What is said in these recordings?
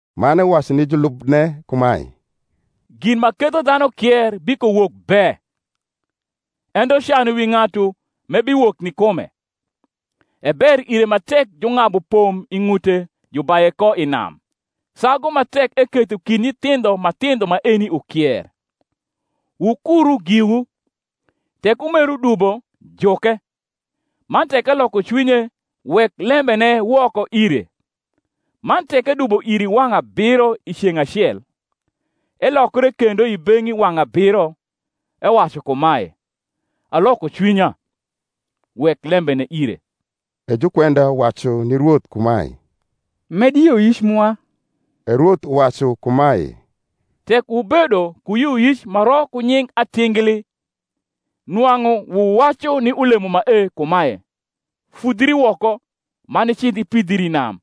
Man ewacu ni julubne kumae, Gin ma ketho dhanu kier bikowok be: ento can wi ng’atu, m’ebiwok ni kume! E ber ire ma tek jung’abu pom i ng’ute, jubaye ko i nam, sagu ma tek eketho kind nyithindho ma thindho maeni ukier. Wukuru giwu: tek umeru dubo, juke; man tek eloko cwinye, wek lembene woko ire. Man tek edubo iri wang’ abiro i ceng’ acel, elokre kendo i beng’i wang’ abiro, ewacu kumae, Aloko cwinya; wek lembene ire. E jukwenda wacu ni Rwoth kumae, Med yioyic mwa. E Rwoth uwacu kumae, Tek wubedo ku yioyic ma ro ku nying atingli, nwang’u wuwacu ni ulemo mae kumae, Fudhri woko, man icidh ipidhri i nam;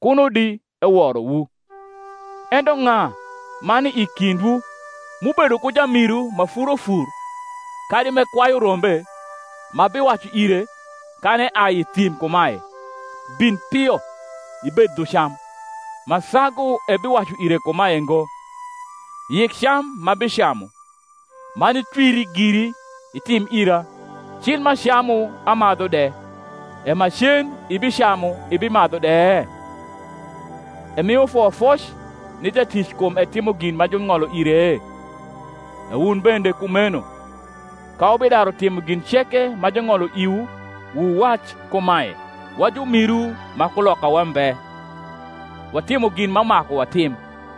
kuno di eworowu. Ento ng’a ma ni i kindwu, m’ubedo ku jamiru ma furo fur kadi m’ekwayu rombe, ma biwacu ire, kan eai i thim kumae, Bin pio ibed dhu cam; ma sagu ebiwacu ire kumae ngo, Yik cam m’abicamu, man itwiri giri, itim ira, cil m’acamu amadhu de: e macen ibicamu ibimadhu de? Emio foyofoc ni jatic kum etimo gin ma jung’olo ire? E wun bende kumeno, ka wubidaru timo gin ceke ma jung’olo iwu, wuwac kumae, Wa jumiru ma kulokawa mbe; watimo gin ma maku watim.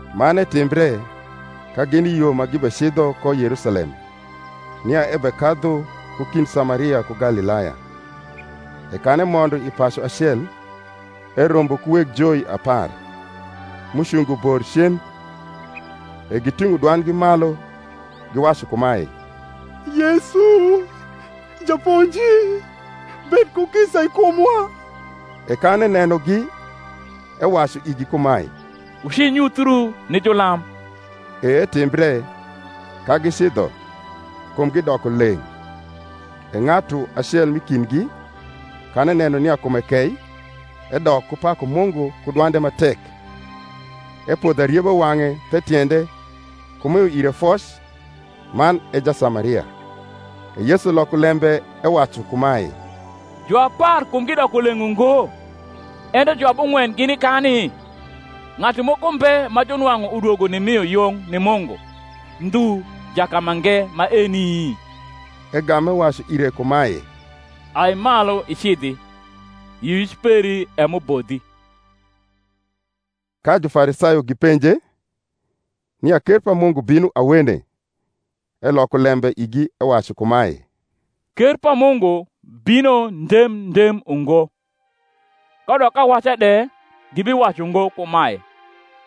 Man etimbre, ka gini i yo ma gibecidho ko Yerusalem, nia ebekadhu ku kind Samaria ku Galilaya. E kan emondo i pacu acel, erombo ku weg joi apar, m’ucungo bor cen: e giting’o dwandgi malu, giwacu kumae, Yesu, Japonji; bed ku kisa i kumwa. E kan enenogi, ewacu igi kumae, Wucinyuthiu ni julam. E etimbre, ka gicidho, kumgi doko leng’. E ng’atu acel m’i kindgi, kan eneno nia kume kei, edok ku paku Mungu ku dwande ma tek; epodho arieba wang’e the tiende, ku mio ire foc: man e Jasamaria. E Yesu loko lembe ewacu kumae, Juapar kumgi doko leng’ ungo? ento juabung’wen gini kani? Ng’atu moko mbe ma junwang’u udwogo nimio yung ni Mungu, ndhu jakamange maeni? Egam ewacu ire kumae, Ai malu icidhi: yioyic peri e m’ubodhi. Ka Jufarisayo gipenje, nia ker pa Mungu bino awene, eloko lembe igi ewacu kumae, Ker pa Mungu bino ndem ndem ungo: kadok awaca de gibiwacu ngo kumae,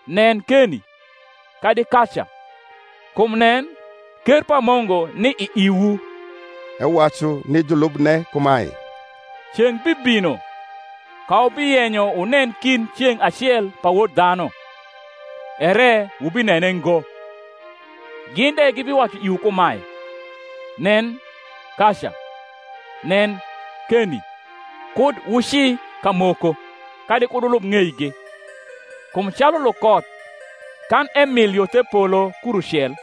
Nen, keni! kadi, Kaca! kum nen, ker pa Mungu ni i iwu. Ewacu ni julubne kumae, Ceng’ bibino, ka wubiyenyo wunen kind ceng’ acel pa Wod dhanu, ere wubinene ngo. Gin de gibiwacu iwu kumae, Nen, kaca! Nen, keni! kud wuci kamoko, kadi kud wulub ng’eigi: kum calu lukoth, kan emil yo the polo kurucel,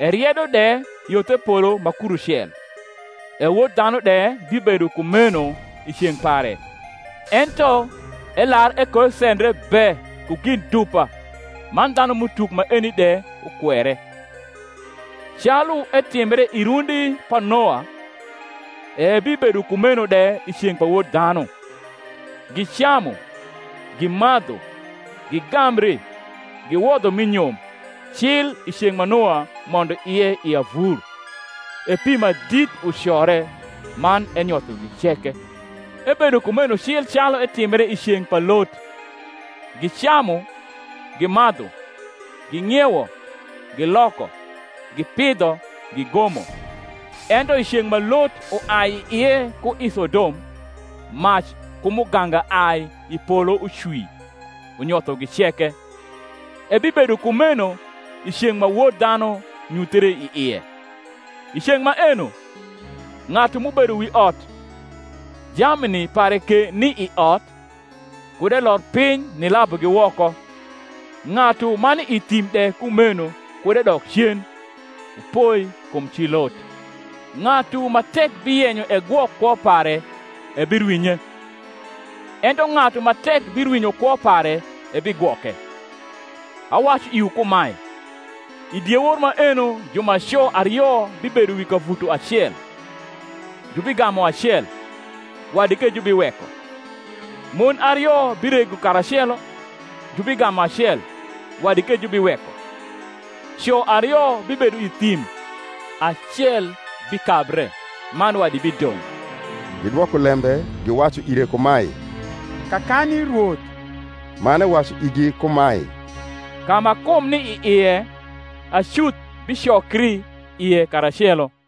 eriedo de yo the polo ma kurucel; e Wod dhanu de bibedo kumeno i ceng’ pare. Ento elar ekoesendre be ku gin dupa man dhanum’utuk maeni de ukwere. Calu etimbre i rundi pa Noa, e ebibedo kumeno de i ceng’ pa Wod dhanu. Gicamu, gimadhu, gigambri, giwodho mi nyom, cil i ceng’ ma Noa mondo ie i avur, e pi ma dit ucore, man enyothogi ceke. Ebedo kumeno cil calu etimbre i ceng’ pa Lot; gicamu, gimadhu, ging’iewo, giloko, gipidho, gigomo: ento i ceng’ ma Lot uai i ie ku i Sodom, mac ku muganga ai i polo ucwi, unyothogi ceke: ebibedo kumeno i ceng’ ma Wod dhanu nyuthre i ie. I ceng’ maeno, ng’atu m’ubedo wi ot, jamni pare ke ni i ot, kud elor piny nilabugi woko: ng’atu ma ni i thim de kumeno kud edok cen. Wupoi kum ci Lot. Ng’atu ma tek biyenyo egwok kwo pare ebirwinye: ento ng’atu ma tek birwinyo kwo pare ebigwoke. Awacu iwu kumae, I diewor maeno jumaco ario bibedo wi kavuto acel; jubigamu acel, wadi ke jubiweko. Mon ario birego karacelo; jubigamu acel wadi ke jubiweko. Co ario bibedo i thim; acel bikabre, man wadi bidong’. Gidwoko lembe giwacu ire kumae, Kakani, Rwoth? Man ewacu igi kumae, Ka ma kum ni i ie, acuth bicokri ie karacelo.